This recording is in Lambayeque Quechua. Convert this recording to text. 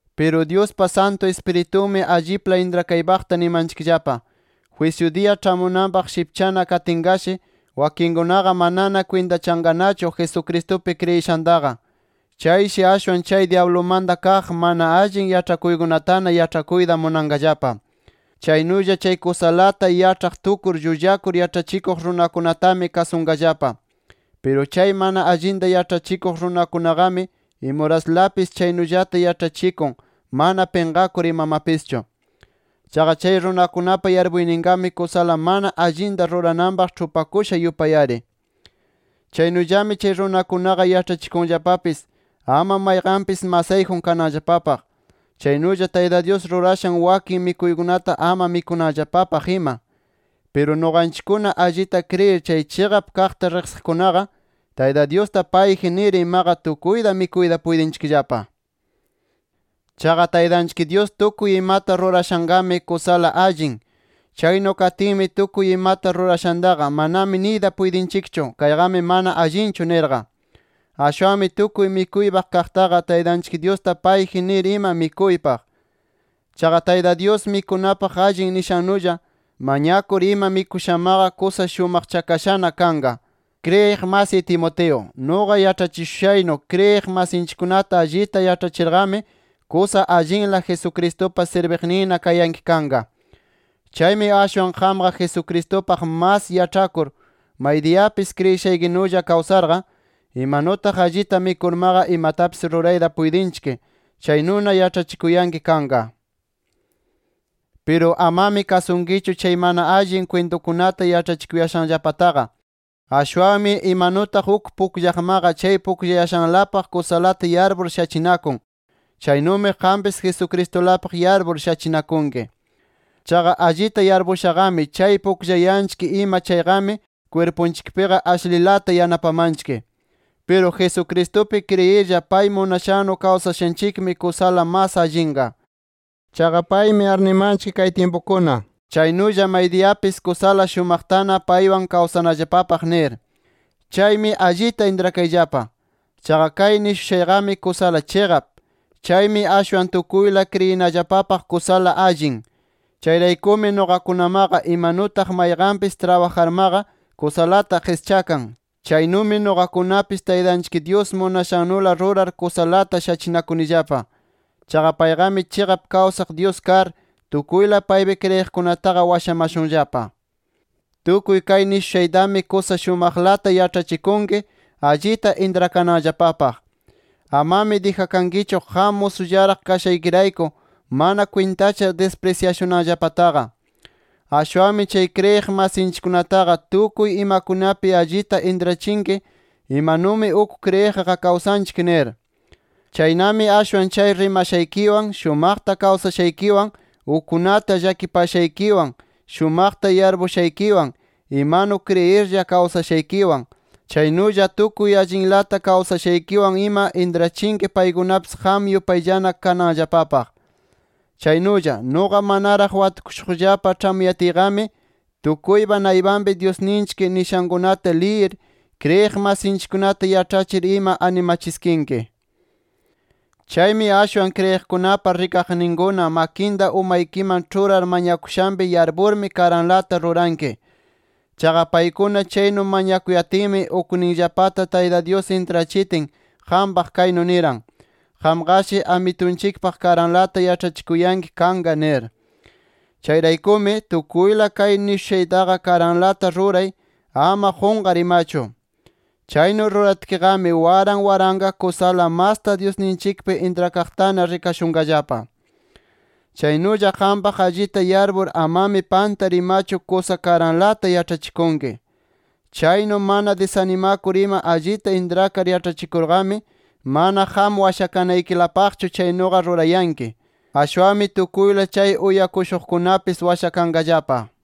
Piru Dyuspa Santu Ispiritunmi allipla intrakaypaqta nimanchikllapa: Jwisyu diya ĉhamunanpaq shipchana katinqashi, wakinkunaqa manana kwintachanqanachu Jesucristupi kriyishantaqa. Chayshi ashwan chay dyablumanta kaq mana allin yaĉhakuykunatana yaĉhakuyta munanqallapa. Chaynulla chay kusalata yaĉhaq tukur llullakur yaĉhachikuq runakunatami kasunqallapa. Piru chay mana allinta yaĉhachikuq runakunaqami imuraslapis chaynullata yaĉhachikun mana pinqakur imamapischu. Chaqa chay runakunapa yarpuyninqami kusala mana allinta rurananpaq ĉhupakusha yupay-ari. Chaynullami chay runakunaqa yaĉhachikunllapapis ama mayqanpis masayjun kananllapapaq. Chaynulla Tayta Dyus rurashan wakin mikuykunata ama mikunanllapapaq ima. Piru, nuqanchikkuna allita kriyir chay chiqap kaqta riqsiqkunaqa, Tayta Dyusta payji nir imaqa tukuyta mikuyta puytinchikllapa. Chaqa Taytanchik Dyus tukuy imata rurashanqami, kusala allin. Chaynu katinmi tukuy imata rurashantaqa, manami niyta puytinchikchu kayqami mana allinchu nirqa. Ashwanmi tukuy mikuypaq kaqtaqa, Taytanchik Dyusta payji nir ima mikuypaq. Chaqa Tayta Dyus mikunapaq allin nishannulla, mañakur ima mikushamaqa, kusa shumaqchakashana kanqa. Kriyiq masiy Timoteo, nuqa yaĉhachishushaynu kriyiq masinchikkunata allita yaĉhachirqami kusa allinla Jesucristupa sirbiqninna kayanki kanqa. Chaymi ashwan qamqa Jesucristupaq mas yaĉhakur, maydiyapis kriyishaykinulla kawsarqa, imanutaq allita mikurmaqa imatapis rurayta puytinchik chaynuna yaĉhachikuyanki kanqa. Piru amami kasunkichu chay mana allin kwintukunata yaĉhachikuyashanllapataqa. Ashwanmi imanutaq uk pukllaqmaqa chay pukllayashanlapaq kusalata yarpur shachinakun, chaynumi qampis Jesucristulapaq yarpur shachinakunki. Chaqa allita yarpushaqami chay pukllayanchik ima chayqami kwirpunchikpiqa ashlilata yanapamanchik. Piru Jesucristupi kriyirlla pay munashannu kawsashanchikmi kusala mas allinqa. Chaqa paymi arnimanchik kay tyimpukuna, chaynulla maydiyapis kusala shumaqtana paywan kawsanallapapaq nir. Chaymi allita intrakayllapa. Chaqa kay nishushayqami kusala chiqap. Chaymi ashwan tukuyla kriyinallapapaq kusala allin. Chayraykumi nuqakunamaqa imanutaq mayqanpis trabajarmaqa kusalata qischakan, chaynumi nuqakunapis Taytanchik Dyus munashannula rurar kusalata shachinakunillapa. Chaqa payqami chiqap kawsaq Dyus kar, tukuyla paypi kriyiqkunataqa washamashunllapa. Tukuy kay nishushaytami kusa shumaqlata yaĉhachikunki, allita intrakananllapapaq. Amami dijakankichu, qam musullaraq kashaykirayku mana kwintachar disprisyashunanllapataqa. Ashwanmi chay kriyiq masinchikkunataqa tukuy imakunapi allita intrachinki, imanumi uk kriyiqqa kawsanchik nir. Chaynami ashwan chay rimashaykiwan, shumaqta kawsashaykiwan, ukkunata llakipashaykiwan, [shumaqta yarpushaykiwan], imanu kriyirlla kawsashaykiwan, chaynulla tukuy allinlata kawsashaykiwan ima intrachinki paykunapis qam yupayllana kananllapapaq. Chaynulla, nuqa manaraq watukushuqllapa ĉhamuyatiyqami, tukuypa naypanpi Dyusninchik nishankunata liyir, kriyiq masinchikkunata yaĉhachir ima animachiskinki. Chaymi ashwan kriyiqkunapa rikaqninkuna makinta umaykiman ĉhurar mañakushanpi yarpurmi karanlata ruranki. Chaqa paykuna chaynu mañakuyatinmi ukninllapata Tayta Dyus intrachitin qampaq kaynu niran: “Qamqashi Amitunchikpaq karanlata yaĉhachikuyanki kanqa” nir. Chayraykumi, tukuyla kay nishushaytaqa karanlata ruray ama qunqar imachu. Chaynu ruratkiqami, waran waranqa kusala masta Dyusninchikpi intrakaqtana rikashunqallapa. Chaynulla qampaq allita yarpur amami pantar imachu kusa karanlata yaĉhachikunki. Chaynu mana disanimakur ima allita intrakar yaĉhachikurqami, mana qam washakanaykilapaqchu chaynuqa rurayanki. Ashwanmi tukuyla chay uyakushuqkunapis washakanqallapa.